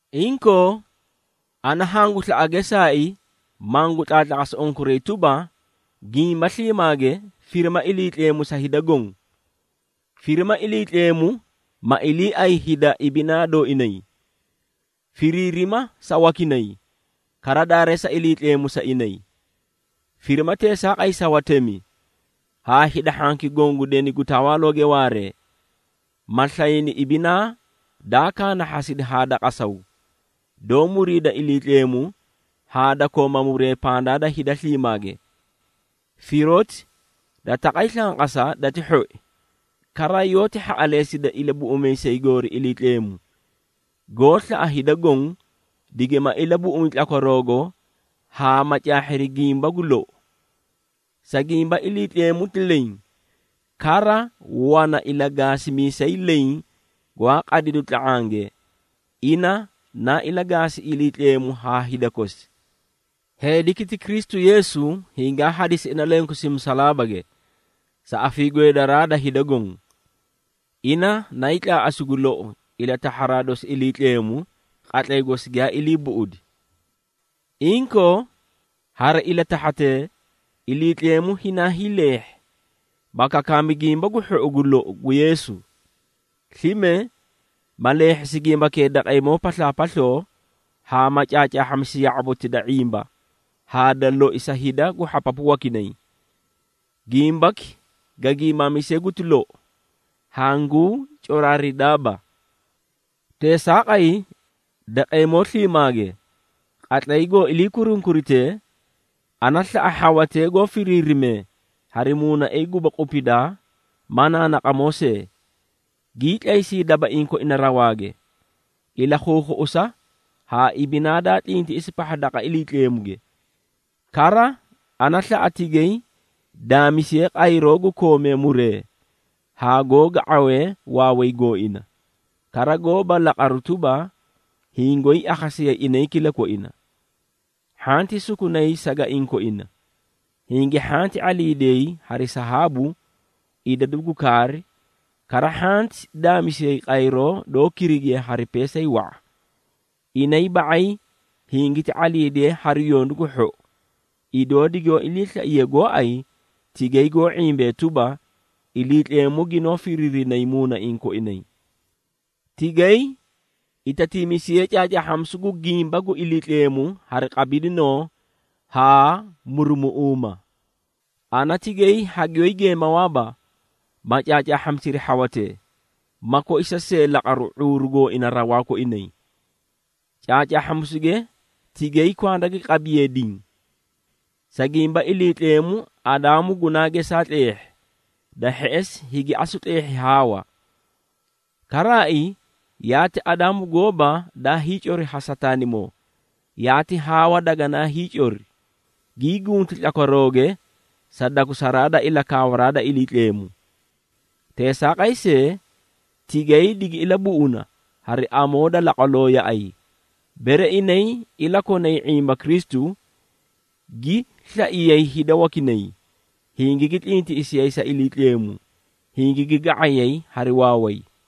Inkoo ana hangu slaꞌa geesaai, mangu tlaatlaqasi unkuray tuba, gimba sliimaage firima Iliitleemu sa hida goõ. Firima Iliitleemu, ma iliiay hida ibinaa dooinay, firiirima sa wakinay, kara daareesa Iliitleemu sa inay. Firima teesaaqay sa watemi, haa hida hhanki goõ gu deni gu tawaalooge waaree, ma slayni ibinaa daa kaanahhasidi haa da qasaw, doó muriida Iliitleemu haa da koomaa muree pandaa da hida sliimaage. Firoti da taqay slanqasa dati hhoi, kara yoóti hhaꞌaleesida Ilabuꞌumiisay goori Iliitleemu, goó slaꞌa hida goõ, digima ilabuꞌumi tlakwaroogo haa ma caahhiri gimba gu lou. Sa gimba Iliitleemu ti leẽ, kara wana ilagaasimiisay leẽ gwaa qadidu tla⁄ange, ina naa ilagaasi Iliitleemu haa hida kosi. Heediki ti Kristu Yeesu, hingaa hadisi ina lenkosi musalaabage, sa afiigweedaraa da hida goõ. Ina nayii tlaaꞌasi gu lou ilatahharaa dosi Iliitleemu, qatlay gosi giyaa ilii buꞌudi. Inkoo, hari ilatahharatee Iliitleemu hinaa hiileehhi, ma kakaami Gimba gu Hhou gu lou gu Yeesu. Slime, ma leehhisi gimbakee daqeemoo paslaapasloo haa ma caacaahhamisi ya⁄aboti da ⁄imba haa da loi sa hida gu hhapapu wakinay. Gimbaki ga giimaamise guti lou, hanguu coraaridaaba. Teesaaqay daqeemoo sliimaage, qatlay goó ilii kurunkuritee, ana slaꞌa hhawatee goõ firinee hari muunaiĩ guba qupidaa ma naanaqamoo see, gii tlaysii dabaiĩ koina rawaage, ilakhuukhuꞌusa haa ibinaa daa tlintiꞌisi pahha daqa Iliitleemuge. Kara ana slaꞌa tigay daamisiyee qayroo gu koomee muree haa goó ga⁄awee waaway gooina, kara goóba laqaruu tuba, hingoyii akhasiyayi inay kilakoina. Hhanti sukunay sagaiĩ koina, hingi hhanti ⁄aliidiyay hari sahaabu, idadu gu kaari, kara hhanti daamisiyay qayroo doó kirigiye hari peesay wa⁄a. Inay ba⁄ay hingiti ⁄aliidiyee hari yondu gu hhou, idoo digoó ilii slaiye gooay tigay goó ⁄imbee tuba, Iliitleemu ginoó firiirinay muunaiĩ koinay. Tigay itatiimisiyee caacaahhamisu gu gimba gu Iliitleemu hari qabidinoo haa murumuꞌuuma. Ana tigay hagiyoó geemawaaba, ma caacaahhamisiri hhawatee, ma koisa see laqaru ⁄uuru gooina rawaa koinay. Caacaahhamisuge tigay kwanda gi qabiyeei diĩ. Sa gimba Iliitleemu Adaamu gunaa geesa tleehhi, da hheꞌesi higi asu tleehhi Haawa. Karaai yaati Adaamu gooba daa hiicori ha Sataanimoo, yaati Haawa daganaa hiicori, gii gunti tlakwarooge sa dakusaraa da ilakaawa da Iliitleemu. Teesaaqay see tigay digi ilabuꞌuna hari amoo da laqwaloo yaꞌay, bere inay ilakonay ⁄imba Kristu, gi slaiyay hida wakinay, hingigi tlintiꞌisiyay sa Iliitleemu, hingigi ga⁄ay hari waaway.